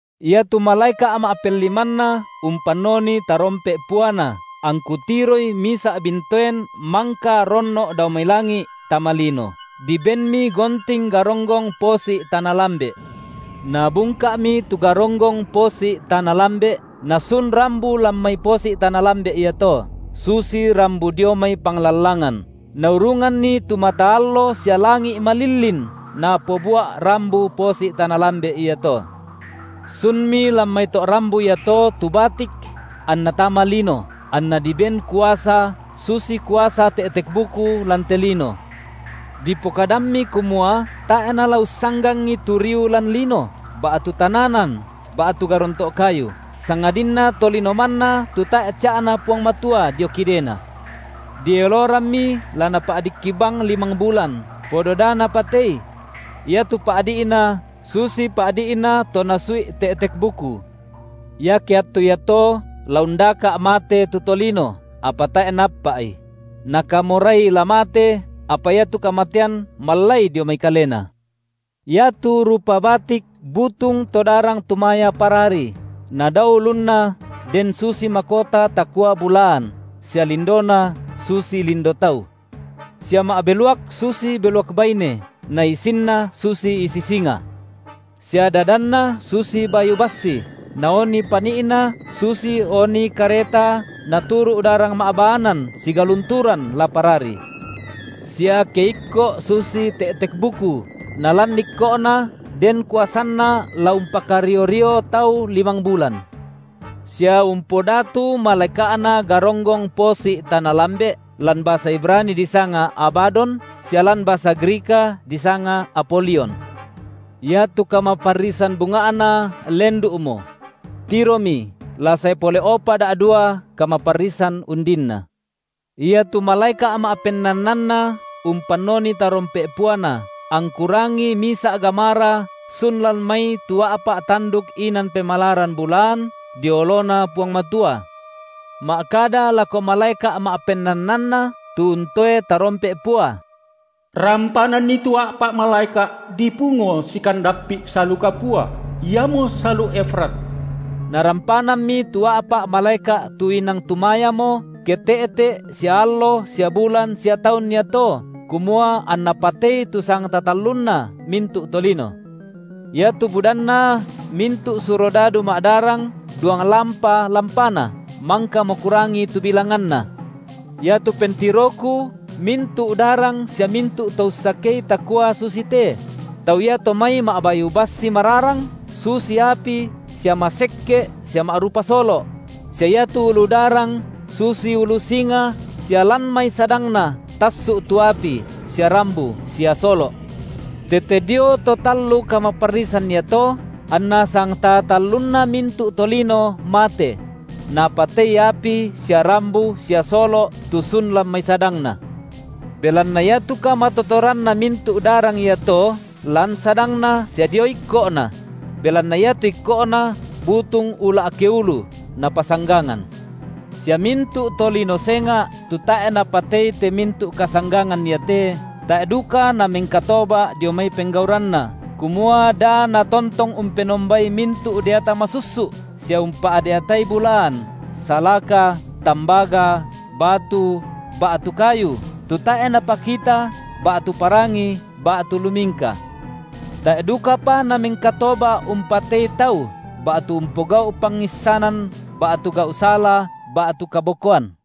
Iatu malaeka’ ma’pellimanna umpannoni tarompe’ puana, angku tiroi misa’ bintoen mangka ronno’ dao mai langi’ tama lino; dibenmi gonting garonggong posi’ tana lambe’. Nabungka’mi tu garonggong posi’ tana lambe’, nasun rambu lan mai posi’ tana lambe’ iato, susi rambu dio mai panglallangan, naurunganni tu mata allo sia langi’ malillin napobua’ rambu posi’ tana lambe’ iato. Sunmi lan mai to’ rambu iato tu batik anna tama lino, anna diben kuasa susi kuasa te’tek-buku lan te lino. Dipokadammi kumua tae’ nala ussanggangi tu riu lan lino, ba’tu tananan ba’tu garonto’ kayu, sangadinna tolino manna tu tae’ ca’Na Puang Matua dio kidena. Dielorammi la napa’dikki bang limang bulan, podo da napatei. Iatu pa’di’na susi pa’di’na to nasui’ te’tek-buku. Iake attu iato la undaka’ mate tu tolino, apa tae’ naappa’i; nakamorai la mate, apa iatu kamatean mallai dio mai kalena. Iatu rupa batik butung to darang tumaya parari, nadao ulunna den susi makota takua bulaan, sia lindona susi lindo tau. Sia ma’beluak susi beluak baine na isinna susi isi singa. Sia dadanna susi bayu bassi, na oni pani’na susi oni kareta naturu’ darang ma’baanan sigalunturan la parari. Sia keikko’ susi te’tek-buku, nalan ikko’na den kuasanna la umpakario-rio tau limang bulan. Sia umpodatu malaeka’na garonggong posi’ tana lambe’, lan basa Ibrani disanga Abadon, sia lan basa Grika disanga Apolion. Iatu kamaparrisan bunga’na lendu’mo. Tiromi la sae pole’opa da’dua kamaparrisan undinna. Iatu malaeka’ ma’pennannanna umpannoni tarompe’ puana, angku rangi misa’ gamara sun lan mai tu a’pa’ tanduk inan pemalaran bulaan dio oloNa Puang Matua, ma’kada lako malaeka’ ma’pennannanna tu untoe tarompe’ pua: Rampananni tu a’pa’ malaeka’ dipungo sikandappi’ salu kapua, iamo salu Efrat. Narampanammi tu a’pa’ malaeka’ tu inang tumayamo, ke te’te’ sia allo sia bulan sia taun iato, kumua anna patei tu sangtaa tallunna mintu’ tolino. Iatu budanna mintu’ surodadu ma’darang duanglampa lampana, mangkamo kurangi tu bilanganna. Iatu pentiroku mintu’ darang sia mintu’ to ussakei takua susite: tau iato mai ma’bayu bassi mararang susi api sia masekke’ sia ma’rupa solo’; sia iatu ulu darang susi ulu singa sia lan mai sadangna tassu’ tu api sia rambu sia solo’. Tete dio to tallu kamaparrisan iato, anna sangtaa talluna mintu’ tolino mate: napatei api sia rambu sia solo’ tu sun lan mai sadangna. Belanna iatu kamatotoranna mintu’ darang iato lan sadangna sia dio ikko’na: belanna iatu ikko’na butung ula’ keulu, napasanggangan. Sia mintu’ tolino senga’ tu tae’ napatei te mintu’ kasanggangan iate, tae’ duka namengkatoba’ dio mai penggauranna, kumua da natontong umpenombai mintu’ deata masussu’ sia umpa’deatai bulaan, salaka, tambaga, batu, ba’tu kayu, tu tae’ napakita ba’tu parangi ba’tu lumingka. Tae’ dukapa namengkatoba’ umpatei tau ba’tu umpogau’ pangissanan ba’tu gau’ sala ba’tu kabokoan.